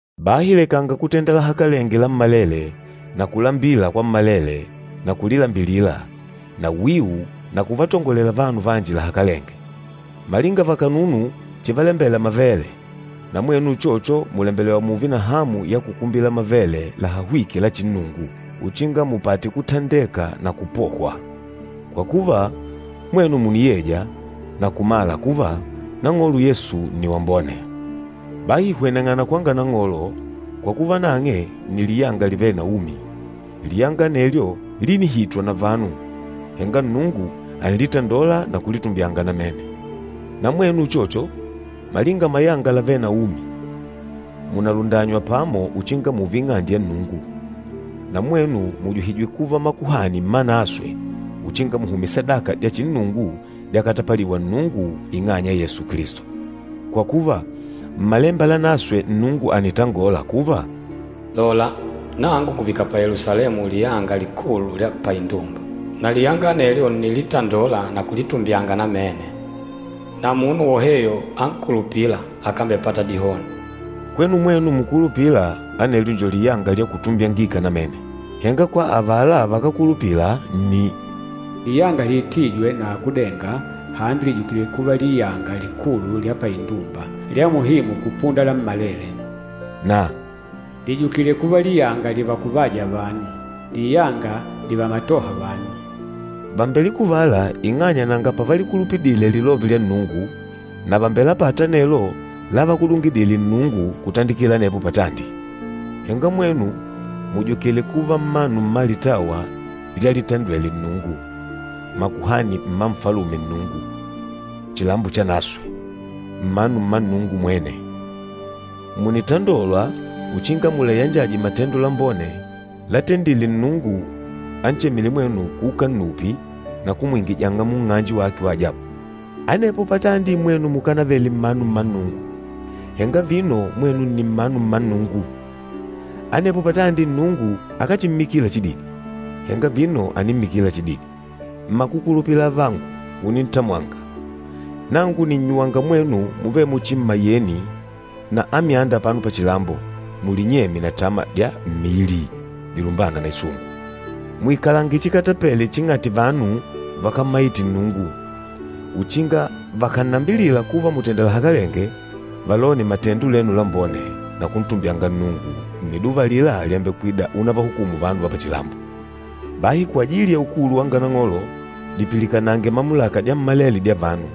Bahi lekanga kutenda lahakalenge lammalele na kulambila kwammalele na kulilambilila, na wiu na kuvatongolela vanu vanji lahakalenge. Malinga vakanunu chivalembela mavele, na mwenu uchocho mùlembelewa mùùve na hamu ya kukumbila mavele lahahwîke la chinnungu, uchinga mupate kutandeka na kupohwa. Kwa kuva, mwenu mùniyeja na kumala kuva Nang'olo Yesu nni wambone. Bahi hweneng'ana kwanga Nang'olo, kwa kuva nang'e nni liyanga livêle na umi. Liyanga anelyo línihitwa na vanu, henga Nnungu ànilitandola na kulitumbyanga namene. Na mwenu uchocho, malinga mayanga lavêle na umi, mùnalundanywa pamo uchinga mùùve ing'ande ya Nnungu. Na mwenu mùjuhijwe kuva makuhani mmanaswe uchinga muhumye sadaka dya chinnungu dyakatapaliwa Nnungu ing'anya ya Yesu Kilisto. Kwa kuva, Mmalemba Lanaswe Nnungu ànitangola kuva, “Lola, nangu ngùvika pa Yelusalemu liyanga likulu lya paindumba, na liyanga anelyo ǹnilitandola na kulitumbyanga namene. Na munu woheyo ankulupîla akámbepata dihoni.” Kwenu mwenu mukulupîla, anelyo njo liyanga lya kutumbyangika namene. Henga kwa avala vakákulupila nni, “Liyanga lihitwîje na akúdenga, hambi lìjukile kuva liyanga likulu lya paindumba, lya muhimu kupunda lammalele.” Na, “Lìjukile kuva liyanga livakuvâja vanu, liyanga livamatôha vanu.” Vàmbelikuvala ing'anya nanga pavalikulupidile lilove lya Nnungu, na vàmbelapata anelo lávakudungidìlè Nnungu kutandikila anepo patandi. Henga mwenu mùjukile kuva mmanu mma litawa lyalitandwele Nnungu, makuhani mma Nfalume Nnungu, chilambo chanaswe, mmanu mma Nnungu mwene. Mùnitandolwa uchinga mulayanjaje matendo lambone látendìlè Nnungu anchemîle mwenu kuuka nnupi na kumwingijanga munng'anje wake wa ajabu. Anepo patandi mwenu mukánavele mmanu mma Nnungu, henga vino mwenu nni mmanu mma Nnungu. Anepo patandi Nnungu akáchimmikila chididi, henga vino ànimmikila chididi. Mmakukulupila avangu unintamwanga, nangu nìnnyuwanga mwenu muvêle muchi mmayeni na amyanda apano pachilambo, mulinyemye na tama dya mmili dilumbâna na isungu. Muikalange chikatapele ching'ati vanu vakámmaite Nnungu, uchinga vakànnambilila kuva mùtenda lahakalenge, valone matendo lenu lambone na kuntumbyanga Nnungu nniduva alila lyambekwida unavahukumu vanu va pachilambo. Bahi kwajili ya ukulu wanga Nang'olo, dipilikanange mamulaka dyammalele dya vanu,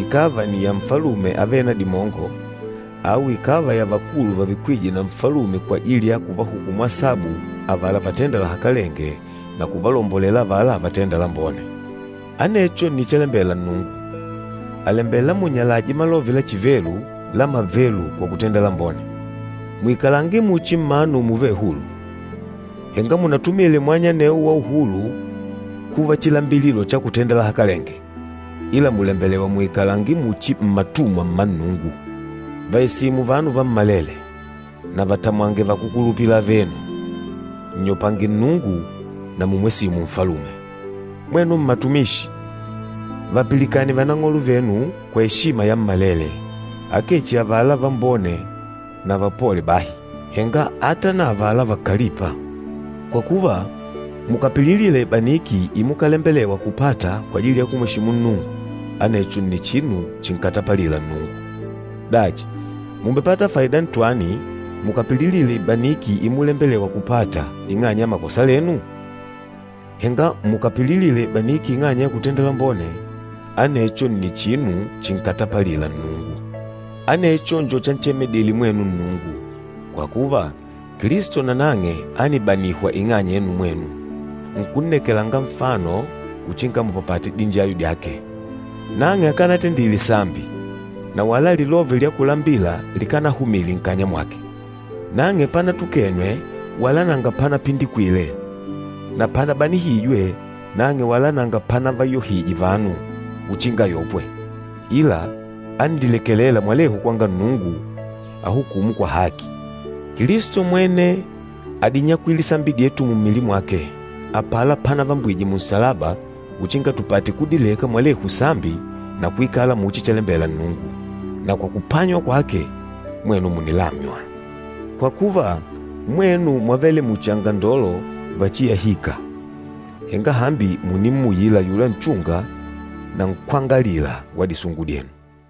ikàva ni ya nfalume avêle na dimongo, au ikàva ya vakulu vavikwîje na nfalume kwajili ya kuvahukumu asabu avala vatênda lahakalenge na kuvalombolela avala vatênda lambone. Anecho nni chalembela Nnungu, àlembela munyalaje malove la chivelu la mavelu kwa kutenda lambone. Muikalange muchi mmanu muvêle hulu, henga munatumile mwanya anewo wa uhulu kuva chilambililo cha kutenda lahakalenge, ila mùlembelewa muikalange muchi mmatumwa mma Nnungu. Vàesimu vanu vammalele, na vatamwange vakúkulupila avenu, nnyopange Nnungu na mùmwesimu nfalume. Mwenu mmatumishi, vapilikane vanang'olo venu kwa eshima yammalele, akee chihi avala vambone na vapole bahi, henga ata na avala vákalìpà. Kwa kuva, mukàpililila ibaniki imukalembelewa kupata kwajili ya kumweshimu Nnungu, anecho nni chinu chinkatapalîla Nnungu. Dachi, mùmbepata faida ntwani mukàpililila ibaniki imulembelewa kupata ing'anya ya makosa lenu? Henga mukàpililila ibaniki ing'anya ya kutenda lambone, anecho nni chinu chinkatapalîla Nnungu. Anecho njo chanchemedile mwenu Nnungu, kwa kuva, Kilisto nanang'e ánibanihwa ing'anya yenu mwenu, nkunnekelanga nfano uchinga mupapate dinjayo dyake. Nang'e akanatendile sambi, na wala lilove lya kulambila likánahumile nkanya mwake. Nang'e panatukenwe wala nanga panapindikwile, na panabanihijwe, nang'e wala nanga panavayohije vanu uchinga ayopwe, ila ánililekelela mwalehu kwanga Nnungu, ahukûmu kwa haki. Kilisto mwene ádinyakwile sambi dyetu mummili mwake, apala pánavambwije munsalaba uchinga tupate kudileka mwalehu sambi na kuikala muchi chalembela Nnungu. Na kwa kupanywa kwake, mwenu mùnilamywa. Kwa kuva, mwenu mwávele muchi angandolo vachiyahîka, henga hambi mùnimmuyila ayula Nchunga na Nkwángalila wa disungu dyenu.